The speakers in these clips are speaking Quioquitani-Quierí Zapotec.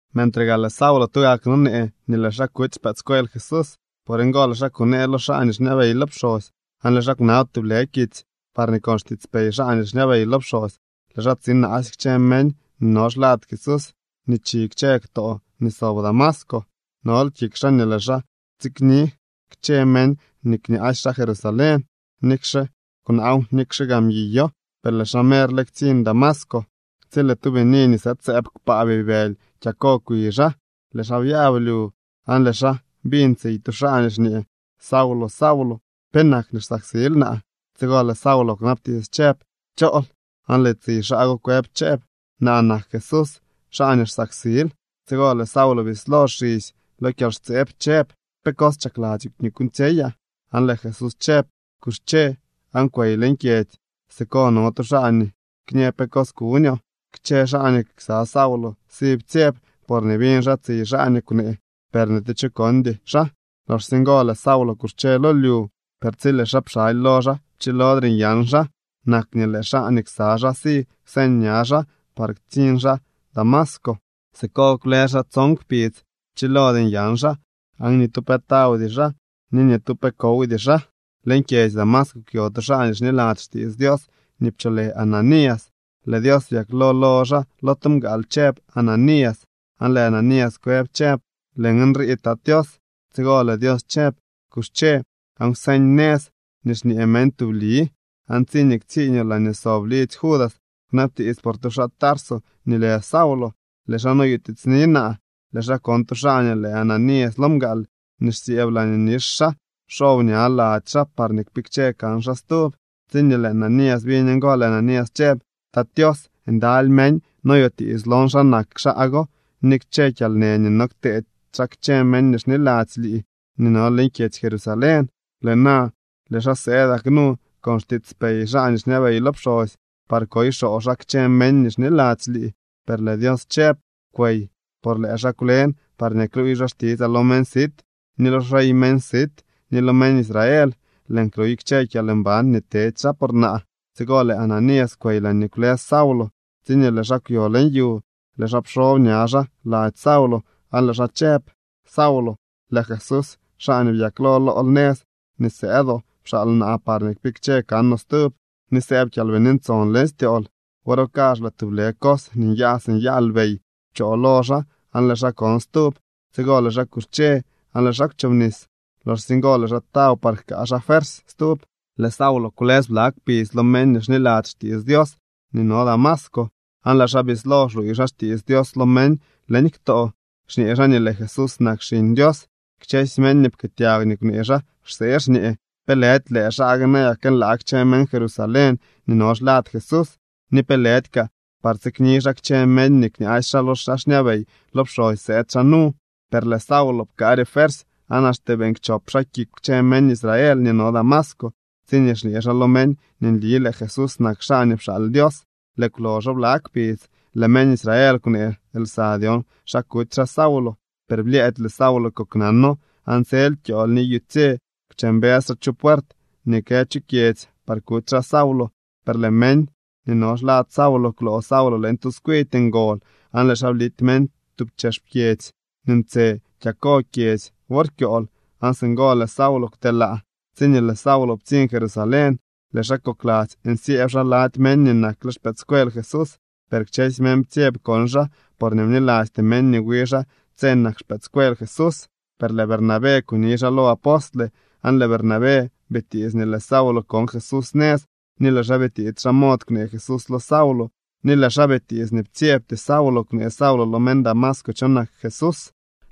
Mentre gaa lëë Saulo tugak nonee nii lëë xaa kuty xpëëdscuel Jesús. Por ngo, lëë xaa kunee lo xaa nii xñabey lo pxosy. Aan lëë xaa kwnab tublë kitsy parñee con xtiitspey xaa nii xñabey lo pxosy lëë xaa tsinaasy kchë meñ nii no xlad Jesús nii chi kchë ktoo nii sob Damasco. Nol kik xaa nii lëë xaa tsikni kchë meñ nii kñaasy xaa Jerusalén, nikxe kwnaaw nikxe gaa mguiyo. Per lëë xaa merle ktsiñ Damasco, tsi lëë tu bini nii sëëd sëëb kpaa bibëly kyako kwi xaa. Lëë xaa byab lyu, aan lëë xaa biñ tsiy tu xaa nii xñee: —Saulo, Saulo, ¿penak nii xsaksil naa? Tsigo lëë Saulo kwnabtiits chëb: —¿Chool? Aan lëë tsiy xaa go kwëb chëb: —Naa nak Jesús, xaa nii xsaksil. Tsigo lëë Saulo bislo xisy lo kyalxtseeb chëb: —¿Pe cos chakladzyoo nii kuuñtsyeyaa? Aan lëë Jesús chëb: —Kuxche aan kwey leñ kyedzy. Siko no tu xaa nii kñë pe cos kuñoo. Kchë xaa nii ksa Saulo si ptsyeb, porñee biñ xaa tsiy xaa nii kwnee, per ni tu cho kondy xaa. Loxsye ngo lëë Saulo kuxche lo lyu, per tsi lëë xaa pxaly lo xaa pchilodre nyan xaa. Nak nii lëë xaa nii ksa xaa si kwseñ ña xaa par ktsiñ xaa Damasco. Siko kwlës xaa tson kpidz. Pchilody nyan xaa, aan ni tu pe tawdy xaa ni ni tu pe kowdy xaa. Leñ kyedzy Damasco kwyo tu xaa nii xniladzy xtiits Dios nii pcholë Ananías. Lëë Dios byaklo lo xaa lo tu mgaal chëb: —¡Ananías! Aan lëë Ananías kwëb chëb: —Lëën nrii, Tat Tios. Tsigo lëë Dios chëb: —Kuxche aan kwseñ nëz nii xñee meñ Tubli, aan tsiñee ktsiiñoo laañee sob lidzy Judas kwnabtiits por tu xaa Tarso nii lë Saulo. Lëë xaa noyutiitsni naa. Lëë xaa kon tu xaa nii lë Ananías lo mgaal nii xsyëëb laañee nix xaa, xob ña lady xaa parñee kpikche kan xaa stub. Tsiñee lëë Ananías biñ ngo, lëë Ananías chëb: —Tat Tios, ndaly meñ noyutiits lon xa nak xaa go ni kchë kyalnë nii no kteedy xaa kchë meñ nii xniladzy lii nii no leñ kyedzy Jerusalén. Lëë na lëë xaa sëëdak nu con xtiitspey xaa nii xñabey lo pxosy par koy xoo xaa kchë meñ nii xniladzy lii. Per lëë Dios chëb: —Kwey, por lëë xaa kwlen parñee kluuy xaa xtitsaa lo meñ sit ni lo xrey meñ sit ni lo meñ Israel. Lëën kluy kchë kyalmban nii tedy xaa por naa. Tsigo lëë Ananías kwey laañee kwlës Saulo. Tsiñee lëë xaa kwyo leñ yu, lëë xaa pxob ña xaa lady Saulo aan lëë xaa chëb: —Saulo, lëë Jesús, xaa nii byaklo lool nëz nii sëëdoo, pxaal naa parñee kpikche kanoo stub ni sëëb Kyalbini Ntson leñ styool. Wor go kazh lëë tublë cos nii nyaa si nyaa lbey pchoo lo xaa aan lëë xaa kon stub. Tsigo lëë xaa kuxche aan lëë xaa kwchobnis. Loxsye ngo lëë xaa taw par jkaa xaa fuersy stub. Lëë Saulo kwlës bla kpidz lo meñ nii xniladzy xtiits Dios nii no Damasco, aan lëë xaa bislo xluuy xaa xtiits Dios lo meñ leñ ktoo, xñee xaa nii lëë Jesús nak Xiñ Dios. Kchësy meñ nii pkëëtyag nii kwnee xaa xsee, xñee: —¿Pe lëdy lëë xaa gue nayak kënlaag kchë meñ Jerusalén nii no xlad Jesús? ¿Ni pe lëdy kaa par tsikni xaa kchë meñ nii kñaasy xaa lo xaa xñabey lo pxosy sëëd xaa nu? Per lëë Saulo pkaare fuersy, aan axte beeñ kchop xaa kik kchë meñ Israel nii no Damasco, tsiñee xñee xaa lo meñ nii nli lëë Jesús nak xaa nii pxaal Dios. Lëë kwloxo bla kpidz, lëë meñ Israel kwnee lsa dyon xa kuty xaa Saulo, per blyëëdy lëë Saulo koknano. Aan tsel kyool ni yutsye kwche mbës xaa chu puert nii kë chu kyedzy par kuty xaa Saulo. Per lëë meñ nii no xlad Saulo kwloo Saulo leñ tu tskwidy ngol aan lëë xaa blity meñ tub chex pyedzy nii ntse kyako kyedzy wor kyool, aan singo lëë Saulo kwtelaa. Tsiñee lëë Saulo ptsiñ Jerusalén, lëë xaa kokladzy nsyëëb xaa lady meñ nii nakle xpëëdscuel Jesús, per kchësy meñ ptsyeb kon xaa porñee bnilasty meñ nii wi xaa tse nak xpëëdscuel Jesús. Per lëë Bernabé kuni xaa lo apostle. Aan lëë Bernabé bitiits nii lëë Saulo kon Jesús nëz, ni lëë xaa bitiits xa mod kwnee Jesús lo Saulo, ni lëë xaa bitiits nii ptsyebty Saulo kwnee Saulo lo meñ Damasco cho nak Jesús.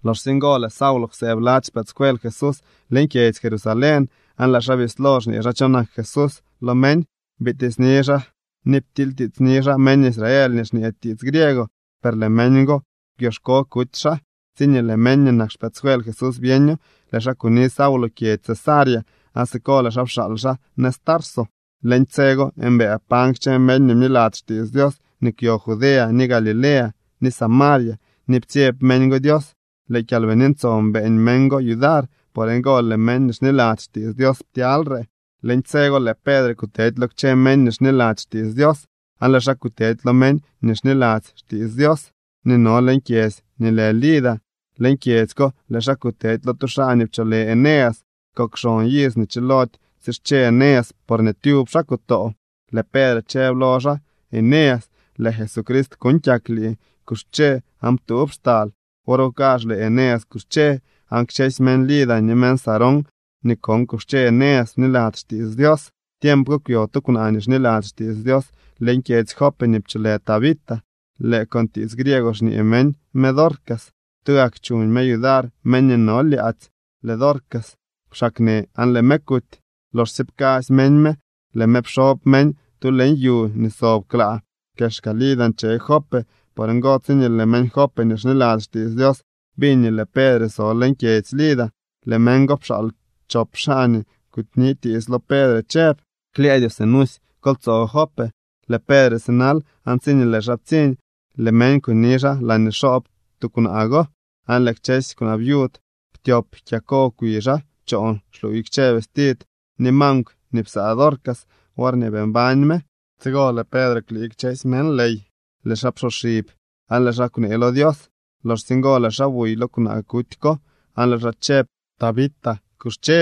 Loxsye ngo lëë Saulo kwsëëb lady xpëëdscuel Jesús leñ kyedzy Jerusalén aan lëë xaa bislo xñee xaa cho nak Jesús lo meñ. Bitiitsni xaa ni ptilytiitsni xaa meñ Israel nii xñee tiits griego, per lëë meñ go kwyoxko kuty xaa. Tsiñee lëë meñ nii nak xpëëdscuel Jesús byeño, lëë xaa kuni Saulo kyedzy Cesarea, aan siko lëë xaa pxaal xaa nëz Tarso. Leñ tse go mbëë pañ kchë meñ nii bniladzy xtiits Dios nii kwyo Judea, ni Galilea, ni Samaria ni ptsyeb meñ go Dios. Lëë Kyalbini Ntson beeñ meñ go yudar, por ngo lëë meñ nii xniladzy xtiits Dios ptyalyre. Leñ tse go lëë Pedre kutedy lo kchë meñ nii xniladzy xtiits Dios, aan lëë xaa kutedy lo meñ nii xniladzy xtiits Dios nii no leñ kyedzy nii lë Lida. Leñ kyedzy ko lëë xaa kutedy lo tu xaa nii pcholë Eneas. Kok xon iz nii chilody tsische Eneas, porñee tyub xaa kutoo. Lëë Pedre chëb lo xaa: —Eneas, lëë Jesucrist kuuñ kyak lii. Kuxche aan ptuub xtal. Wor go kazh lëë Eneas kuxche, aan kchësy meñ Lida ni meñ Sarón nii kon kuxche Eneas bniladzy xtiits Dios. Tiemp ko kwyo tu kwnaa nii xniladzy xtiits Dios leñ kyedzy Jope nii pcholë Tabita. (Lëë con tiits griego xñee meñ me Dorcas.) Tugak chuñ me yudar meñ nii no lyaadzy. Lëë Dorcas kwxaaknë aan lëë me kuty. Loxsye pkasy meñ me, lëë me pxob meñ tu leñ yu nii sob klaa. Kexka Lida nche Jope. Por ngo, tsiñee lëë meñ Jope nii xniladzy xtiits Dios biñ nii lëë Pedre so leñ kyedzy Lida, lëë meñ go pxaal chop xaa nii kunitiits lo Pedre chëb: —Klyëëdyoo, sinusy kol tsoo Jope. Lëë Pedre sinal aan tsiñee lëë xaa ptsiñ, lëë meñ kuni xaa laañee xoob tuukwnaa go, aan lëë kchësy kwnaa viud ptyop kyako kwi xaa choon xluuy kchë vestid ni mankw nii psaa Dorcas worñee bii mbañ me. Tsigo lëë Pedre kwlii kchësy meñ ley, lëë xaa psoxib, aan lëë xaa kwnee lo Dios. Loxsye ngo lëë xaa buy lo kwnaa kuty ko, aan lëë xaa chëb: —Tabita, kuxche.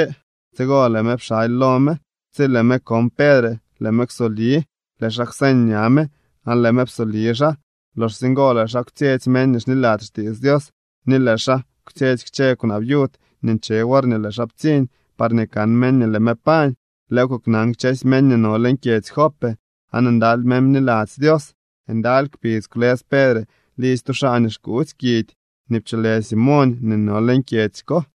Tsigo lëë me pxaly lo me. Tsi lëë me kon Pedre, lëë me kwsobli. Lëë xaa kwseñ ña me aan lëë me psoli xaa. Loxsye ngo lëë xaa kwtsyetsy meñ nii xniladzy xtiits Dios ni lëë xaa kwtsyetsy kchë kwnaa viud nii nche worñee lëë xaa ptsiñ parñee kan meñ nii lëë me pañ. Lëëw koknan kchësy meñ nii no leñ kyedzy Jope, aan ndaly meñ bniladzy Dios. Ndaly kpidz kwlës Pedre lidzy tu xaa nii xkuutsy kidy nii pcholë Simoñ nii no leñ kyedzy ko.